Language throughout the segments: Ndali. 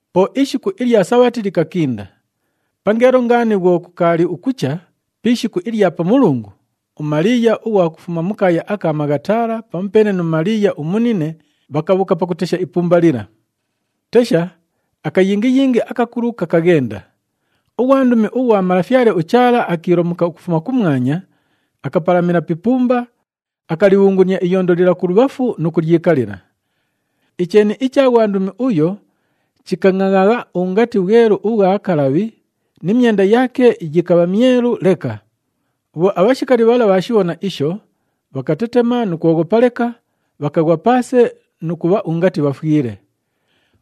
Po ishiku ilya Sabhati likakinda. Pangeelo ngaani bhwo kukaali ukucha pi ishiku ilya Pamulungu, uMaliiya ughwa kufuma mu kaaya aka Maghatala pamupeene nu Maliiya umunine bhakabhuuka pakutesha ipumba lila. Tesha, akayingiyingi akakulu kakaghenda. Ughwandumi ughwa Malafyale uChaala akiilomuka ukufuma kumwanya, akapalamila pi ipumba, akalibhungunia iyondo lila kulubhafu nu kulyikalila. Icheeni icha ghwandumi uyo chikangʼangʼagha ungati bhwelu ubhwa kalabhi ni myenda yaake yikabha myelu leka. Bhwo abhashikali bhala bhaashibhona isho, bhakatetema nu kwoghopa leka, bhakaghwa paase nu kubha ungati bhafwile.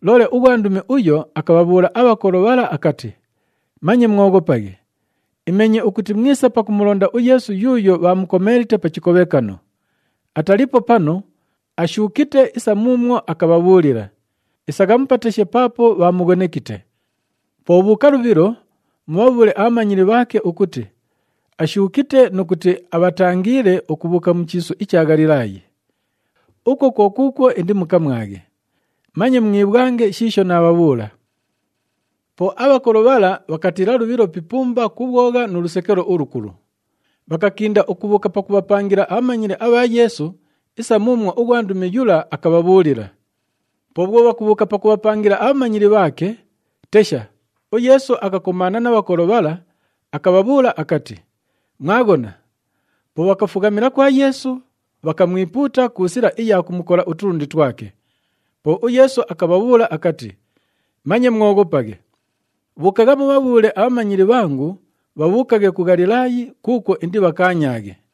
Loole ughwandumi uyo akabhabhuula abhakolo bhala akati, “Manye mwoghopaghe! Imeenye ukuti mwisa pakumulonda uYeesu yuuyo bhaamukomeelite pa chikobhekano. Ataliipo panu, ashuukite isa muumwo akabhabhuulila. Isagha mupateshe paapo bhaamughonekite. Po bhuuka lubhilo, mubhabhuule abhamanyili bhaake ukuti, ‘Ashuukite nu kuti abhatangiile ukubhuuka mu chiisu icha Ghalilaayi. Ukwo kwo kuukwo indimukamwaghe.’ Manye mwibhwange shiisho naabhabhuula!” Po abhakolo bhala bhakatiila lubhilo pi ipumba ku bhwogha nu lusekelo ulukulu. Bhakakinda ukubhuuka pakubhapangila abhamanyili abha Yeesu isa muumwo ughwandumi yula akabhabhuulila. Po bhwo bhakubhuuka pakubhapangila abhamanyili bhaake, tesha, uYeesu akakomaana na bhakolo bhala, akabhabhuula akati, “Mwaghona!” Po bhakafughamila kwa Yeesu, bhakamwipuuta ku sila iya kumukola utulundi twake. Po uYeesu akabhabhuula akati, “Manye mwoghopaghe. Bhuukagha mubhabhuule abhamanyili bhangu bhabhuukaghe ku Ghalilaayi kuukwo indibhakaanyaaghe.”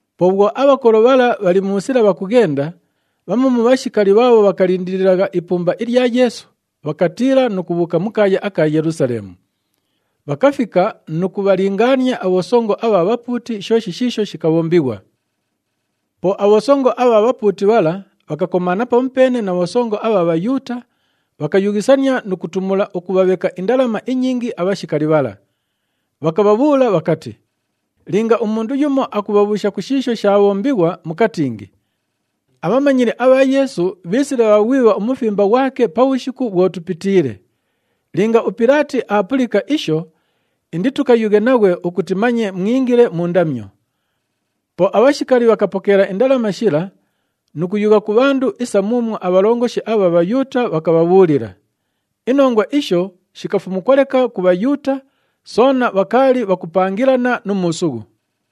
Po bhwo abhakolo bhala bhali mu sila bhakughenda, bhamu mu bhashikali bhaabho bhakalindililagha ipumba ilya Yeesu bhakatiila nu kubhuuka mu kaaya aka Yelusaleemu. Bhakafika nu kubhalingaania abhosongo abha bhapuuti shooshi shiisho shikabhombighwa. Po abhosongo abha bhapuuti bhala bhakakomaana pamupeene na bhosongo abha Bhayuuta, bhakayughisania nu kutumula ukubhabheka indalama inyingi abhashikali bhala. Bhakabhabhuula bhakati, “Linga umundu yumo akubhabhuusha ku shiisho shaabhombighwa mukatingi, ‘Abhamanyili abha Yeesu bhiisile bhaaghwibha umufimba ghwake pabhushiku bhwo tupitiile.’ Linga uPilaati aapulika isho, inditukayughe naghwe ukuti manye mwingile mu ndamyo.” Po abhashikali bhakapokeela indalama shila nu kuyugha ku bhandu isa muumwo abhalongoshi abha Bhayuuta bhakabhabhuulila. Inongwa isho shikafumukwa leka ku Bhayuuta, soona bhakaali bhakupangilana nu muusughu.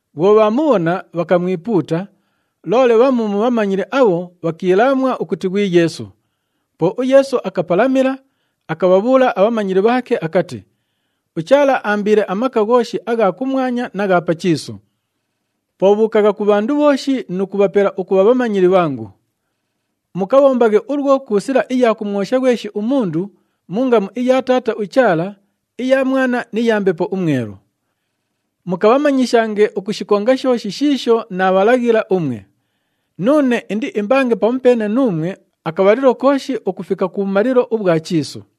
Bhwo bhaamubhona, bhakamwipuuta, loole bhamu mu bhamanyili abho bhakiilaamwa ukuti ghwi Yeesu. Po uYeesu akapalamila, akabhabhuula abhamanyili bhaake akati, “UChaala aambiile amaka ghooshi agha kumwanya na gha pa chiisu. Po bhuukagha ku bhandu bhooshi nu kubhapela ukubha bhamanyili bhangu. Mukabhombaghe ulwo ku sila iya kumwosha ghweshi umundu mu ngamu iya Taata uChaala, iya Mwana ni ya Mbepo uMwelu. Mukabhamanyishange ukushikonga shooshi shiisho naabhalaghila umwe. Nuune indiimbange pamupeene nuumwe akabhalilo kooshi ukufika kubhumalilo ubhwa chiisu.”